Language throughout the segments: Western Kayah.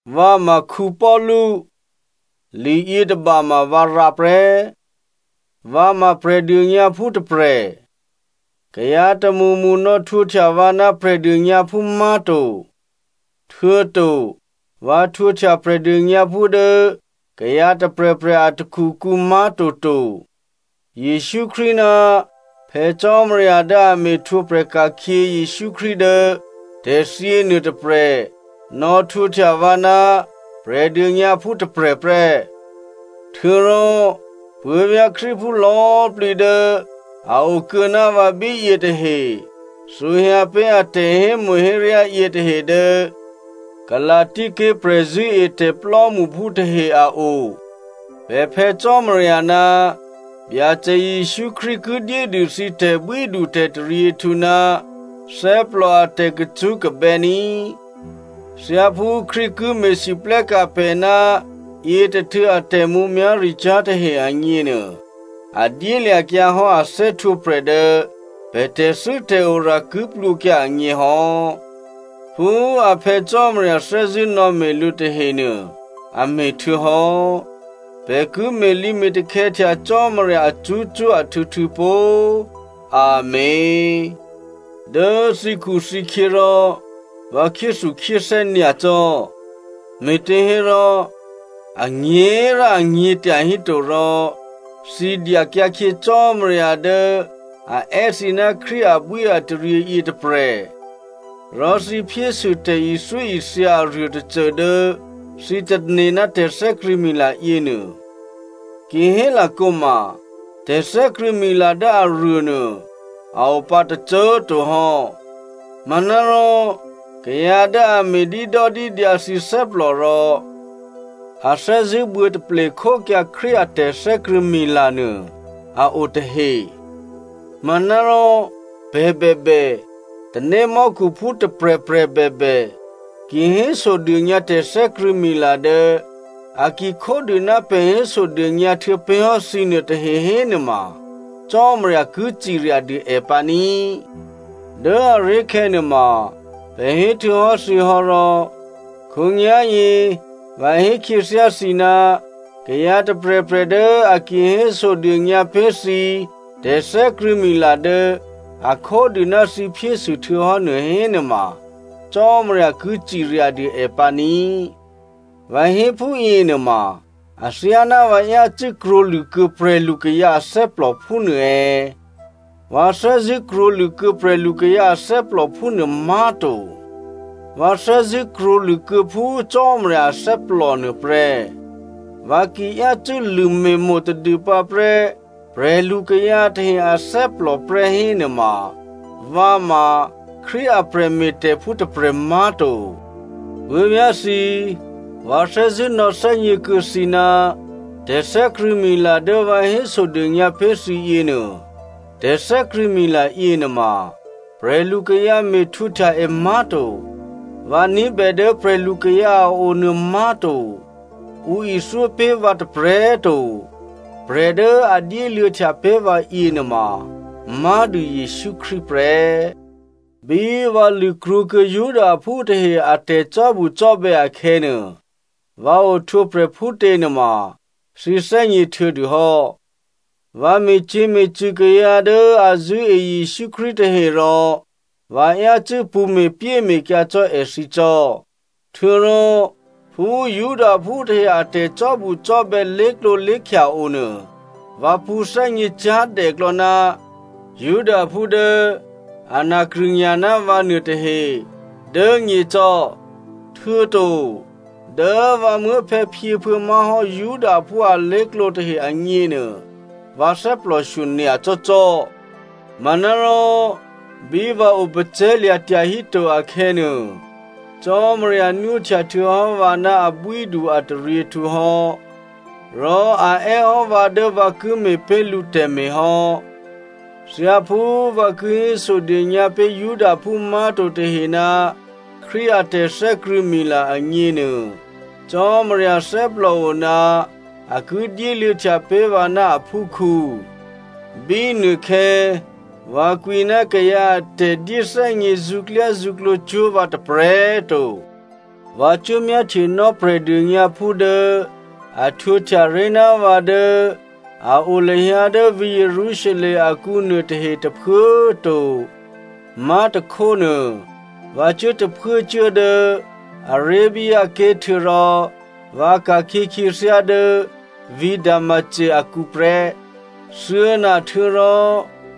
Vǎ ma Paulu, liyětôba ma vǎ rǎ prè́. Vǎ ma Prè̤dônyǎphú tôprè̤. Kayǎ tômṳmṳ nò̌htwǒhtya vǎ ná Prè̤dônyǎphú má̤to. Htuô̌to, vǎ htwǒhtya Prè̤dônyǎphú dố kayǎ tôprè̤prè̤ a takhukǔ má̤to to. Jesǔ Krístu ná Phè̌ Cò́marya dố a me̤htwǒprè̤ ka̤khyě Jesǔ Krístu dố tè̤thyě nuôtôprè̤ nò̌htwǒhtya vǎ ná Prè̤dônyǎphú tôprè̤ prè́. Htuô̌rò puố̤vyá̤ Krístuphú lò̌꤮ plǐ dố a o kuô̌ ná vǎ bíyě tahe, thǔhyǎ pé̤ a tè̤hémo̤héryá yětahe dố Galasia ké̤ prè̤zṳ̂́etè̤ plò́mṳphú tahe a o. Pè̤ Phè̌ Cò́marya ná Byacè Jesǔ Krístu ki dyédû thǐ tè̤bwídutè̤taryěhtǔ ná thè́plò a tè̤kacṳ́kabè́ ní꤮. Thyáphú Krístu ki me̤lwóhteka̤ pè̤ ná yětôhtû̌ a tè̤mǔmyá̤ricyá̤ tahe agněnuô, a dyélya̤kyǎ hò́ a thè́htwǒprè̤ dố pè̤ tè̤thû́tè̤ora ki plwǒkyǎ agně hò́. Phú a Phè̌ Cò́marya thè́zṳ̂́ nò̌me̤ lǔ tahenuô, a me̤htuô̌hò́. Pè̤ ki me̤lǐme̤takhè̌htya Cò́marya acṳ́cṳ́ ahtû̌htû̌ pó꤮. Amèn. Dố thǐkhuthǐkhyě rò vǎ khyéthukhyéthè́ nyacò́, me̤těhérò, anyě̤꤮ rò anyě̤ tyahíto rò, thǐ dyakyǎkhyě Cò́marya dố a è́ thǐ ná Krístu abwíataryě yětôprè̤. Rò thǐ phyésû tè̤ithyóithya aruô tôcô dố thǐ tane̤ ná tè̤thè́krṳ̂̌mila yěnuô. Ki hélakǒ ma tè̤thè́krṳ̂̌mila dố aruô nuô a o pǎ tôcô꤮ to hò́, manárò kayǎ dố a me̤dídòdídyǎ thǐ thè́plò rò a thè́zṳ̂́ buô̌taple khókyǎ Krístu a tè̤thè́krṳ̂̌mila nuô a o tahe. Manárò pè̤ bèbè, tanémò́khuphú tôprè̤prè̤ bèbè, ki hésodônyǎ tè̤thè́krṳ̂̌mila dố a ki khódû ná pè̤ hésodônyǎ htuô̌pé̤hò́ thǐnuô tahe hénuôma Cò́marya ki cirya dû è pǎ ní꤮. Dố aré̤khè̌ nuôma pè̤ héhtuô̌hò́ thǐ hò́ rò khǒnyá̤yě vǎ hé khyěthyá thǐ, kayǎ tôprè̤prè̤ dố a ki hésodônyǎ pé̤ thǐ tè̤thè́krṳ̂̌mila dố a khódû ná thǐ phyésû htuô̌hò́nuô hénuôma, Cò́marya ki ciryadû è pǎ ní꤮. Vǎ hé phúyě nuôma athyáná vǎ yácû́ krwǒlṳ̂ kuô̌ prè̤lukayǎ athè́plò phúnuô è̌? Vǎ thè́zṳ̂́ krwǒlṳ̂ kuô̌ prè̤lukayǎ athè́plò phúnuô má̤to. Vǎ thè́zṳ̂́ krwǒlṳ̂kuô̌ phú Cò́marya athè́plò nuôprè́. Vǎ ki yácû́ lṳ̂me̤mo̤ tadûpǎ prè́ prè̤lukayǎ tahe athè́plò prè́ hénuôma, vǎ ma Krístu a prè̤me̤tè̤phú tôprè̤ má̤to. Puố̤vyá̤thǐ, vǎ thè́zṳ̂́ nò̌thè́gněkuô̌ thǐ ná tè̤thè́krṳ̂̌mila dố vǎ hésodônyǎ pé̤ thǐ yěnuô, tè̤thè́krṳ̂̌mila yěnuôma prè̤lukayǎ me̤htwǒhtya è má̤to. Vǎ ní̤bè dố prè̤lukayǎ a o nuô má̤to. Ǔ ithyó pé̤ vǎ tôprè̤꤮ to. Prè̤ dố a dyéluô̌htya pé̤ vǎ yěnuôma má̤dû Jesǔ Krístu prè́. Bí vǎ lṳ̂krwǒkuô̌ Judaphú tahe a tè̤cò́bucò́bè̌ akhè̌nuô, vǎ ohtwǒprè̤ phútě nuôma thǐ thè́gně htuô̌dûhò́. Vǎ me̤cyě̤me̤cṳ̂ kayǎ dố a zṳ̂́e Jesǔ Krístu tahe, rò vǎ yácû́ pṳ̌ me̤pyéme̤kyǎ cò́ èthǐ cò́. Htuô̌rò phú Judaphú tahe a tè̤cò́bucò́bè̌ lé̤klǒlé̤khya onuô, vǎ pṳ̌thè́gně cyá̤dèklò̌ ná Judaphú dố ana krṳ̂nya̤ ná vǎ nuôtahe dố nyěcò́, htuô̌to dố vǎ muố̤phè̌phyěphuô̌ má̤hò́ Judaphú alé̤klǒ tahe agněnuô, vǎ thè́plòshyo nyacò́cò́. Manárò, bí vǎ opacè̤̌lya̤ tyahíto akhè̌nuô, Cò́marya nwóhtya htuô̌hò́ vǎ ná abwídu-ataryěhtǔ hò́, rò a è́ hò́ vǎ dố vǎ ki me̤ pé̤ lǔ tè̤me̤ hò́. Thyáphú vǎ ki hésodônyǎ pé̤ Judaphú má̤to tahe ná Krístu a tè̤thè́krṳ̂̌mila agněnuô, Cò́marya thè́plòo ná a ki dyéluô̌htya pé̤ vǎ ná aphúkhǔ. Bínuôkhè̌, vǎ kwǐ ná kayǎ a tè̤dyéthè́gně zṳ̌klyázṳ̌klǒ cwó̤ vǎ tôprè̤꤮ to. Vǎ cuố myáhtyenò́ Prè̤dônyǎphú dố a htwǒhtya ré̤ ná vǎ dố a o lahyǎ dố vǐ̤ Jerusalem akǔ nuôtahe tôphuố꤮ to. Má̤tôkhónuô, vǎ cuố tôphuốcuố dố꤮ Arabia ké̤ htuô̌rò vǎ ka̤khyě khyěthyá dố vǐ̤ Damasco akǔ prè́. Thuô̌na htuô̌rò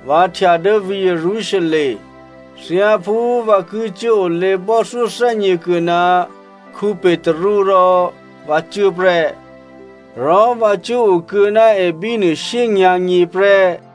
vǎ htya dố vǐ̤ Jerusalem. Thyáphú vǎ ki cuốolě bò́thyó thè́gněkuô̌ ná Petru rò vǎ cuố prè́. Rò vǎ cuố okuô̌ ná è bínuô shyényǎ̤nyě prè́.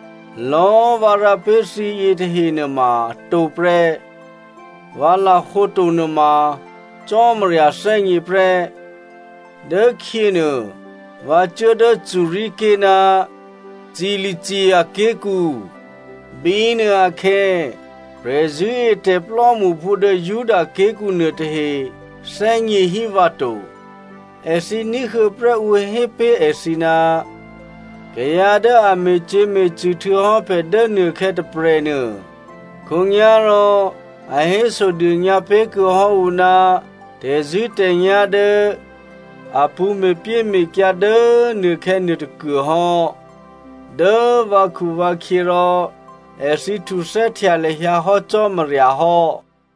Lò̌꤮ vǎ rǎ pé̤ thǐ yětahe nuôma atǒ prè́. Vǎ lahǒ to nuôma Cò́marya thè́gně prè́. Dốkhyě nuô vǎ cuố dố Syria ké̤ ná Cilicia ké̤kǔ. Bínuôakhè̌, prè̤zṳ̂́etè̤ plò́mṳphú dố Juda ké̤kǔ nuôtahe thè́gněhí vǎ to. Èthǐ ní̤huô̌ prè́ ǔ hé pé̤ èthǐ, “Kayǎ dố a me̤cyě̤me̤cṳ̂ htuô̌hò́ pè̤ dố nuôkhè̌ tôprè̤nuô, khǒnyá̤rò a hésodônyǎ pé̤ kuô̌ hò́ ǔ ná tè̤zṳ̂́tè̤nyá̤ dố a pṳ̌ me̤pyéme̤kyǎ dố꤮ nuôkhè̌ nuôtôkuô hò́.” Dố vǎkhuvǎkhyě rò èthǐ htuthè́htya lahyǎ hò́ Cò́marya hò́.